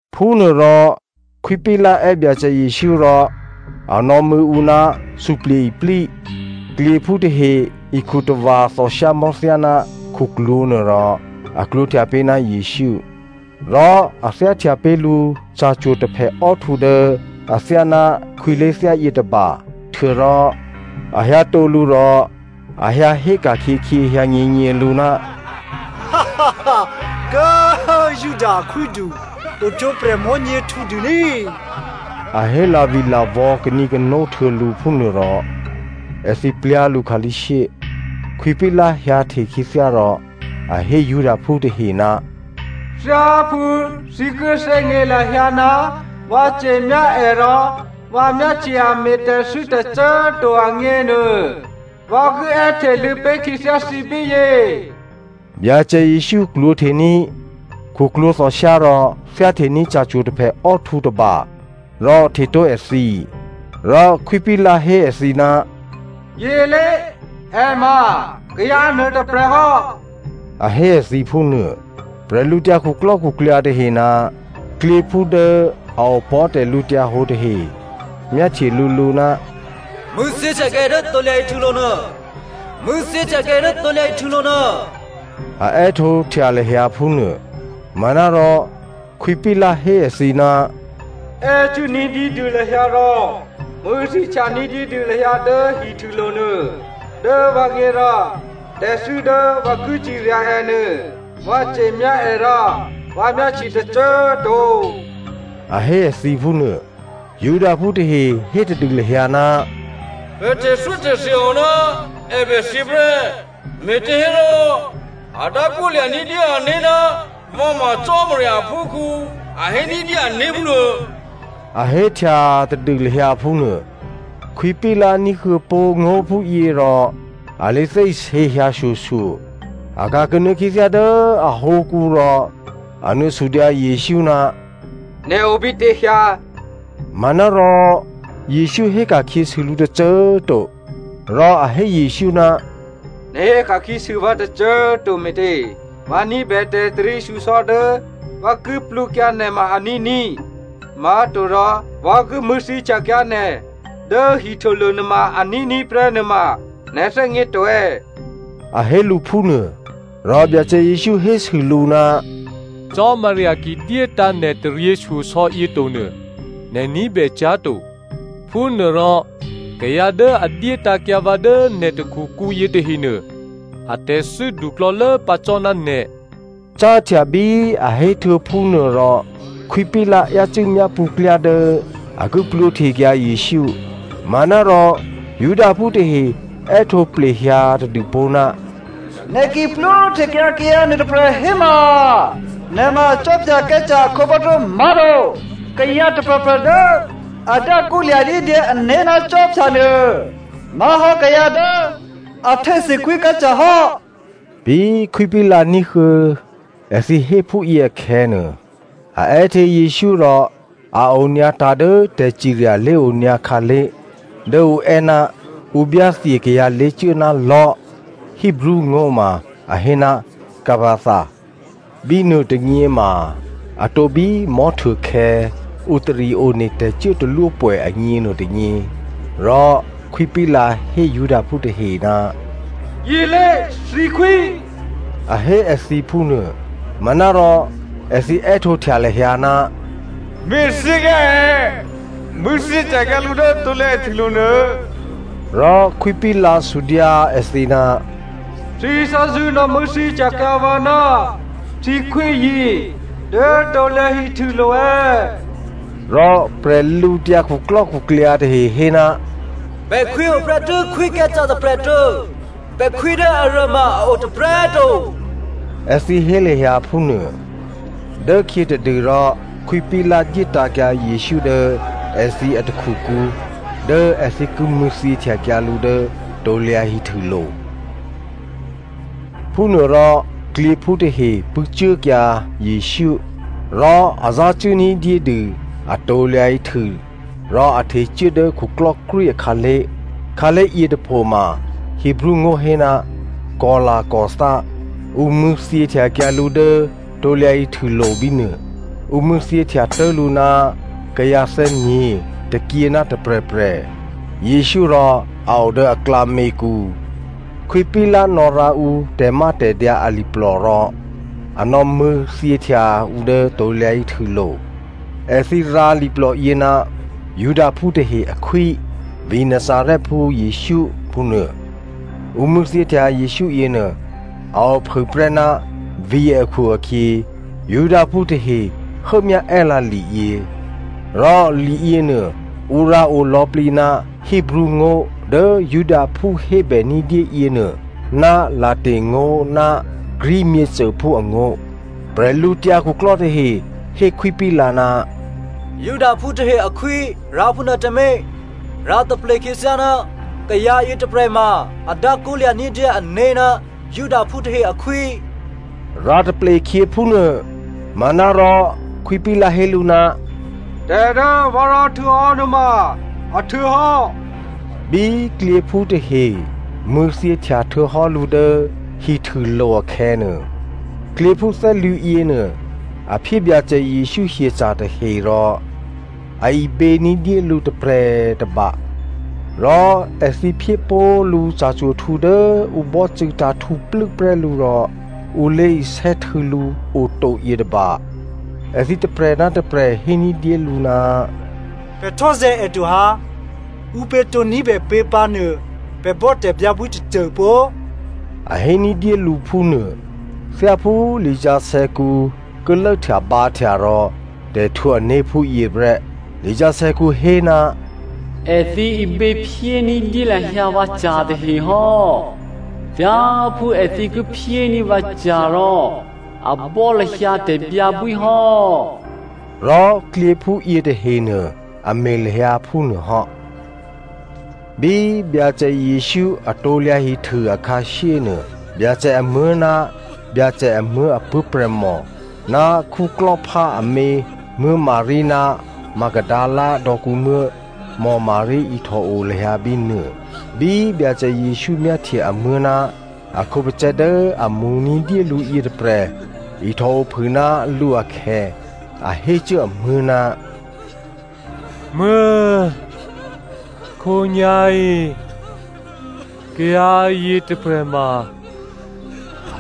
Phúnuôrò Khwí Pilato è́ Byacè Jesǔ rò a nò̌mṳ̂̌ ǔ ná suplye̤ iplí. Klyěphú tahe ikhu tava̤ thòshyámò̤́ thyáná khuklwǒ̤ nuôrò a klwǒ̤htya pé̤ ná Jesǔ. Rò a thyáhtya pé̤ lǔ ca̤cwo̤ taphèò́htǔ dố athyáná khwí lé̤thyá yětôba htuô̌rò, a hyǎtǒ lǔ rò a hyǎhé ka̤khyěkhyě hyǎnyěnyělǔ, “Kố꤮ Juda akhwídu, ohtwǒprè̤ mò̤́nyě htǔdû ní꤮!” A hé lavilavò̌ kanǐkano htuô̌ lǔ phúnuô rò èthǐ plyá̤ lǔ khǎlí̤shyé. Khwí Pilato hyǎhte khyěthyá rò a hé Judaphú tahe, “Thyáphú thǐ ki thè́gně lahyǎ ná vǎ ce̤myá è rò vǎ myáhtye a me̤ tè̤thû́ tôcô꤮ to agněnuô, vǎ ki è́hteluô̌ pé̤ khyěthyá thǐ bíyě.” Byacè Jesǔ klwǒ̤htení̤ khuklwǒ̤ thòshyá rò thyáhtení̤ ca̤cwo̤ taphèò́htǔ tôba rò htetǒ èthǐ. Rò Khwí Pilato hé èthǐ, “Yělé, è ma kayǎ nuôtôprè̤ hò́.” A hé èthǐ phúnuô. Bwídukhu tahe ná klyěphú dố a opò̤́ tè̤lǔhǒdu tahe myáhtye lǔlǔ, “Mṳ̂̌thyěhtyakyǎ è dố krusu díkè hihtûlo̤ nuô, mṳ̂̌thyěhtyakyǎ è dố krusu díkè hihtûlo̤ nuô,” a è́htǒhtya lahyǎ phúnuô. Manárò Khwí Pilato hé èthǐ, “È́cuố ní̤dyédû lahyǎ rò mṳ̂̌thyěhtya ní̤dyédû lahyǎ dố hihtûlo̤ nuô. Dố vǎgně rò, tè̤thû́ dố vǎ ki cirya è nuô, vǎ ce̤myá è rò vǎ myáhtye tôcô꤮ to,” a hé èthǐ phúnuô. Judaphú tahe hé tadû lahyǎ, “Pè̤ tè̤thyótè̤thya o ná è bèthyě prè́, me̤těhérò a dákwó lya̤ ní̤dyé ané̤ ná vǎ ma Cò́marya aphúkhǔ, a hé ní̤dyé ané̤ phúnuô.” A héhtya tadû lahyǎ phúnuô. Khwí Pilato ní̤huô̌ pó̤ ngó̤phúyě rò a lé thè́isě hyǎshyoshyo. A ka̤ kanuô̌ khyěthyá dố ahǒkǔ rò a nuô̌ sudyǎ Jesǔ, “Nè̤ obítě hyǎ?” Manárò Jesǔ héka̤khyěsû lǔ tôcô꤮ to. Rò a hé Jesǔ, “Nè̤ héka̤khyěsû vǎ tôcô꤮ to me̤tě? Vǎ ní̤bè tè̤taryěshyosò̌ dố vǎ ki plwǒkyǎ nè̤ ma a ní̤ní̤, má̤torò vǎ ki mṳ̂̌thyěhtyakyǎ nè̤ dố hihtûlo̤ nuôma a ní̤ní̤ prè́ nuôma nè̤ thè́gně to è̌?” A hé lǔ phúnuô. Rò Byacè Jesǔ hésû lǔ, “Cò́marya ki dyétǎ̤ nè̤ taryěshyosò̌ yě tonuô, nè̤ ní̤bè cyá̤ to. Phúnuôrò kayǎ dố a dyétǎ̤kyǎ vǎ dố nè̤ takhukǔ yětahenuô, atè̤thû́ duklò̌lố pǎ cò́ ná nè̤.” Cáhtya bí a héhtuô̌ phúnuô rò, Khwí Pilato yácû́ myápṳ̌ klyá dố a ki plwǒhtekyǎ Jesǔ. Manárò Judaphú tahe è́htǒ plehyǎ tadûpó̤, “Nè̤ ki plwǒhtekyǎ kayǎ nuôtôprè̤ héma, nè̤ ma Khwí Caesare akhǒbò́thyó má̤to. Kayǎ tôprè̤prè̤ dố a dákwó lya̤ ní̤dyé ané̤ ná khwí nuô, má̤hò́ kayǎ dố a htésû Khwí Caesare hò́.” Bí Khwí Pilato ní̤huô̌ èthǐ héphúyě akhè̌nuô, a è́hte Jesǔ rò a onyǎtǎ̤ dố tè̤cirya lé̤onyǎ khǎlé̤ dố ǔ è́, ǔ byáthye kayǎ lé̤cuố ná lò̤́. Hebreo ngó̤ ma a hé, Gabbatha. Bínuô tônyě ma atǒ bí mò̤́htuôkhè̌ ǔ tari one tè̤cuốtalwópwè̌ agně nuôtônyě. Rò Khwí Pilato hé Judaphú tahe, “Yělé thǐkhwí,” a hé èthǐ phúnuô. Manárò èthǐ è́htǒhtya lahyǎ, “Me̤thyěkyǎ è, mṳ̂̌thyěhtyakyǎ lǔ dố krusu díkè hihtûlo̤ nuô.” Rò Khwí Pilato sudyǎ èthǐ, “Thǐ thè́zṳ̂́ nò̌ mṳ̂̌thyěhtyakyǎ vǎ ná thǐkhwíyě dố krusu díkè hihtûlo̤ è̌?” Rò bwídukhu tahe hé, “Pè̤ khwí oprè́tû́ Khwí Caesare tôprè̤ tuô̌. Pè̤khwí dố aruô ma a o tôprè̤꤮ to,” èthǐ hé lahyǎ phúnuô. Dốkhyětadû rò Khwí Pilato dyétǎ̤kyǎ Jesǔ dố èthǐ atakhukǔ dố èthǐ ki mṳ̂̌thyěhtyakyǎ lǔ dố krusu díkè hihtûlo̤. Phúnuôrò klyěphú tahe pṳ̂́cuốkyǎ Jesǔ. Rò a zácuố ní̤dyédû a krusu rò a htecuố dố khuklò́krwí akhǎlé̤. Khǎlé̤ yětôpho ma Hebreo ngó̤ hé, “Golgotha.” Ǔ mṳ̂̌thyěhtyakyǎ lǔ dố krusu díkè hihtûlo̤ bínuô. Ǔ mṳ̂̌thyěhtya tố̤ lǔ ná kayǎ thè́nyě̤, tôkyě ná tôprè̤prè̤. Jesǔ rò a o dố aklǎměkǔ. Khwí Pilato nò̌rǎ ǔ tè̤mátè̤dyǎ aliplò rò a nò̌mṳ̂̌thyěhtya ǔ dố krusu díkè hihtûlo̤. Èthǐ rǎ liplòyě, “Judaphú tahe akhwí, vǐ̤ Nazarèphú Jesǔ” phúnuô. Ǔ mṳ̂̌thyěhtya Jesǔ yěnuô, a ophûprè́ ná vǐ̤ akhu-akhyě, Judaphú tahe hốmyá è́lǎ liyě. Rò liyěnuô ǔ rǎo lò̌plǐ ná Hebreo ngó̤ dố Judaphú hébè ní̤dyé yěnuô, ná Latin ngó̤ ná Greek myěcôphú angó̤. Prè̤lǔtyǎ khuklò́ tahe hé Khwí Pilato, “‘Judaphú tahe akhwí,’ rǎphúnuô tǎmé̤. Rǎ taple khyěthyá ná kayǎ yětôprè̤ ma a dákwólya̤ ní̤dyé ané̤ ná Judaphú tahe akhwí,” rǎ taple khyě phúnuô. Manárò Khwí Pilato hé lǔ, “Tè̤ dố vǎ rǎhtuô̌hò́ nuôma, a htuô̌hò́.” Bí klyěphú tahe mṳ̂̌thyěhtya htuô̌hò́ lǔ dố hihtûlo̤ akhè̌nuô, klyěphú thè́lwǐ̤ yěnuô a phyé Byacè Jesǔ hyeca̤ tahe rò, a ibě ní̤dyé lǔ tôprè̤ tôba. Rò èthǐ phyé pó̤ lǔ ca̤cwo̤htǔ dố ǔ bò́cû̌ tǎ̤htǔplû́ prè́ lǔ rò ǔ lé̤isè́htû̌ lǔ oto yětôba. Èthǐ tôprè̤ ná tôprè̤ hé ní̤dyélǔ, “Pè̤ htò́zè̤̌ è to ha, ǔpě tǒ ní̤bèpě pǎnuô, pè̤ bò́ tè̤byǎbwí tôcô pó!” A hé ní̤dyé lǔ phúnuô. Thyáphú lisǎsè̌kǔ ki lốhtyabǎhtya rò tè̤htwǒ ané̤ phúyě prè́. Lisǎsè̌kǔ hé, “Èthǐ ibě phyé ní̤dyé lahyǎ vǎca̤ tahe hò́. Thyáphú èthǐ ki phyéní̤ vǎca̤ rò a bò́ lahyǎ tè̤byǎbwí hò́.” Rò klyěphú yětahenuô, a me̤ lahyǎ phúnuô hò́. Bí Byacè Jesǔ a krusu akhǎshyénuô, Byacè amuố̤ ná Byacè amuố̤ apuố̤prè̤mò, ná Clopa amě Maria ná Magdalena dò̌kǔmuố̤ Maria ihtò o lahyǎ bínuô. Bí Byacè Jesǔ myáhtye amuố̤ ná a khǒpacè̤̌ dố a mo̤ ní̤dyé lǔ yětôprè̤ ihtò ophû ná lǔ akhè̌, a hé cuố amuố̤, “Muố̤꤮ khǒnyá̤yě kayǎ yětôprè̤ ma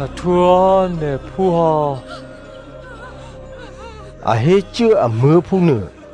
a htwǒhò́ nè̤phú hò́,” a hé cuố amuố̤ phúnuô.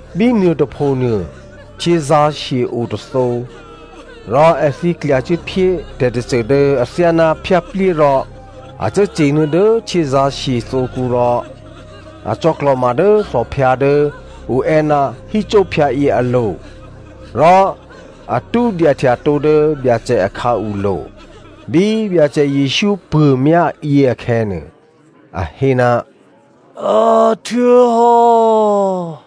Bínuô tôphonuô, htyězǎ̤shye o tôthǒ. Rò èthǐ klyacuốphyé tè̤tôcô dố athyáná phyáplyé rò a cuốcye̤nuô̌ dố htyězǎ̤shye thǒkǔ rò a cò̌klò̤ma dố thòphyǎ dố ǔ è́ ná hyssóphyǎyě alo̤ rò a tṳ́dyahtyatǒ dố Byacè a khǎulo̤. Bí Byacè Jesǔ puô̤myá yě akhè̌nuô, a hé, “A htuô̌hò́.”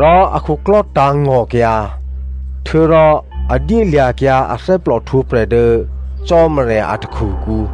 Rò a khuklò́ tǎ̤ngò̤kyǎ, htuô̌rò a dyélya̤kyǎ athè́plò htwǒprè̤ dố Cò́marya a takhukǔ.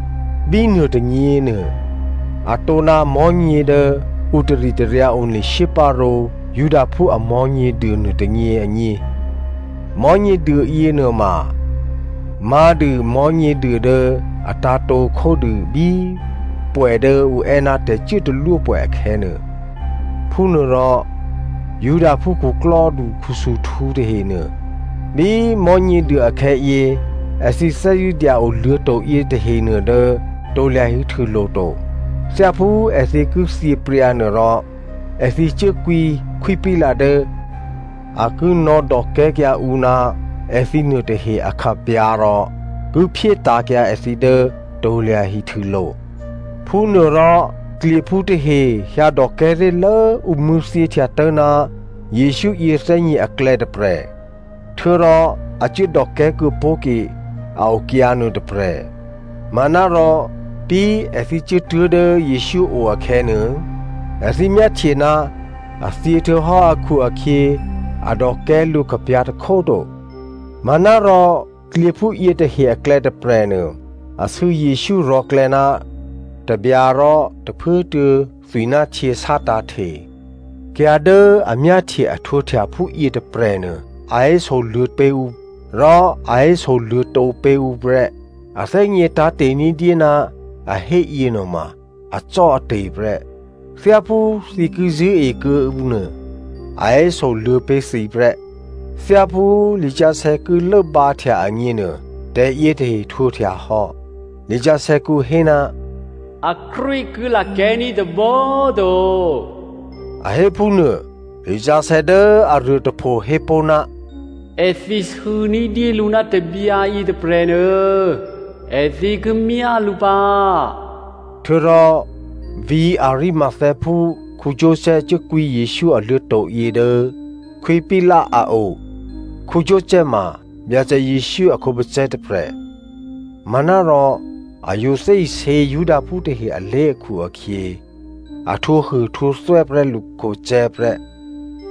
Bínuô tônyěnuô atǒ ná mò̤́nyě dố ǔ taritaryǎ one shyéparǒ Judaphú a Mò̤́nyěduô nuôtônyě agně. Mò̤́nyěduô yěnuôma má̤dû Mò̤́nyěduô dố a tǎ̤tǒ khódû bí pwè̌ dố ǔ è́ ná tè̤cuốtalwópwè̌ akhè̌nuô. Phúnuôrò Judaphú khuklò́du khusuhtǔ tahenuô, bí Mò̤́nyěduô akhè̌yě, èthǐ thè́zṳ̂́ dya-o luô̤̌to̤ yětahenuô dố krusu díkè hihtûlo̤ to. Thyáphú èthǐ ki thyěpryǎnuô rò, èthǐ cuố kwǐ Khwí Pilato dố a ki nò̌dòkè̤́kyǎ ǔ ná èthǐ nuôtahe akhapyǎ̤ rò ki phyétǎ̤kyǎ èthǐ dố krusu díkè hihtûlo̤. Phúnuôrò klyěphú tahe hyǎdòkè̤́ ré̤lố ǔ mṳ̂̌thyěhtya tố̤ná Jesǔ yěthè́nyě̤ aklè̌ tôprè̤. Htuô̌rò a cuố dòkè̤́ kuô̌pó̤ke a okyǎ nuôtôprè̤. Manárò bí èthǐ cuốtuố̤ dố Jesǔ o akhè̌nuô, èthǐ myáhtye ná a thyě htuô̌hò́ akhu-akhyě a dòkè̤́ lǔ khapyǎ̤ tôkhó꤮ to. Manárò klyěphú yětahe aklè̌ tôprè̤nuô, a sû̌ Jesǔ rò̤̌klè̌ ná tabyǎ rò tôphuốtuô̌ thwi ná htyě sátǎ̤hte. Kayǎ dố a myáhtye a htwǒhtya phúyě tôprè̤nuô a hésoluô̌ pé̤ ǔ. Rò a héso luô̌tǒ pé̤ ǔ prè́. A thè́gně tǎ̤te̤ ní̤dyé ná a hé yěnuôma acò́ate̤ prè́. Thyáphú thǐ ki zṳ̂́e kuô̌ǔ nuô, a hésoluô̌ pé̤ thǐ prè́. Thyáphú lisǎsè̌ ki lốbǎhtya agněnuô, tè̤yětahe htwǒhtya hò́. Lisǎsè̌kǔ hé, “Akrwí ki lakè̤́ní̤ tôbǒ꤮ to,” a hé phúnuô. Lisǎsè̌ dố aruôtôpho hé pó̤, “Èthǐ sû̌ ní̤dyélǔ ná tabyǎ yětôprè̤nuô, èthǐ ki myá lǔ pǎ.” Htuô̌rò vǐ̤ Arimatheaphú Joseph cuốkwǐ Jesǔ aluô̤̌to̤ yě dố Khwí Pilato a o. Joseph ma Byacè Jesǔ a khǒpacè̤̌ tôprè̤, manárò a yǒ thè́isě Judaphú tahe alé̤ akhu-akhyě a htwǒhuôhtwǒthwè́ prè́ lǔ khǒpacè̤̌ prè́.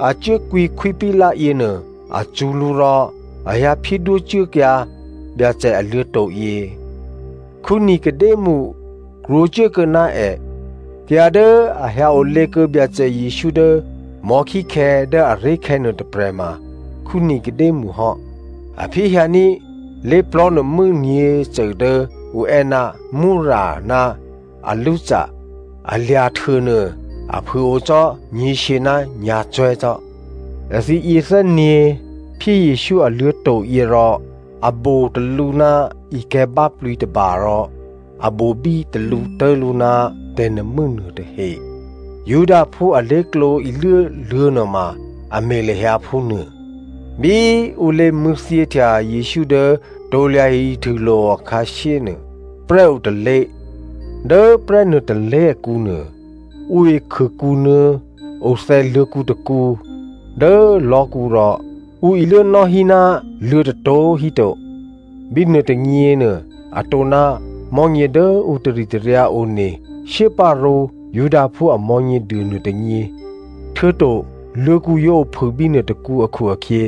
A cuốkwǐ Khwí Pilato yěnuô, a cṳ̌ lǔ rò a hyǎ phyédwó cuốkyǎ Byacè aluô̤̌to̤ yě. Nicodemo krwǒcuốkuô̌ ná è. Kayǎ dố a hyǎ olě kuô̌ Byacè Jesǔ dố mò̤́khíkhè̌ dố aré̤khè̌ nuôtôprè̤ ma Nicodemo hò́. A phyéhyǎní̤ lé̤plò̤́ nuô̤mû́ nyě̤cô dố ǔ è́, myrra ná alósa. A lya̤htuônuô, a phû꤮ o cò́ nyě̤shyě ná nyǎ̤cwè̤́ cò́. Èthǐ yěthè́nyě̤ phyé Jesǔ a luô̤̌to̤yě rò a bo talǔ ná ikè̤̌ báplǐ tôba rò a bobí talǔ tố̤ lǔ ná tè̤nuô̤mû́ nuôtahe. Judaphú alé̤klǒ iluố luô̤̌ nuôma a me̤ lahyǎ phúnuô. Bí ǔ lé̤mṳ̂̌thyěhtya Jesǔ dố krusu díkè hihtûlo̤ akhǎshyénuô, prè́ o tôlé̤. Dố prè́ nuôtôlé̤ akǔnuô, ǔ ikhûkǔnuô̌ othè̌ luô̤̌kǔ tôkǔ dố lò̤́kǔ, rò ǔ iluốnò́ hí ná luô̤̌tôprè̤꤮ híto. Bínuô tônyěnuô atǒ ná mò̤́nyě dố ǔ taritaryǎ one shyéparǒ Judaphú a Mò̤́nyěduô nuôtônyě, htuô̌to luô̤̌kǔ yǒ ophû bínuô tôkǔ akhu-akhyě,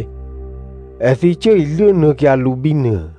èthǐ cuố iluốnuô̌kyǎ lǔ bínuô.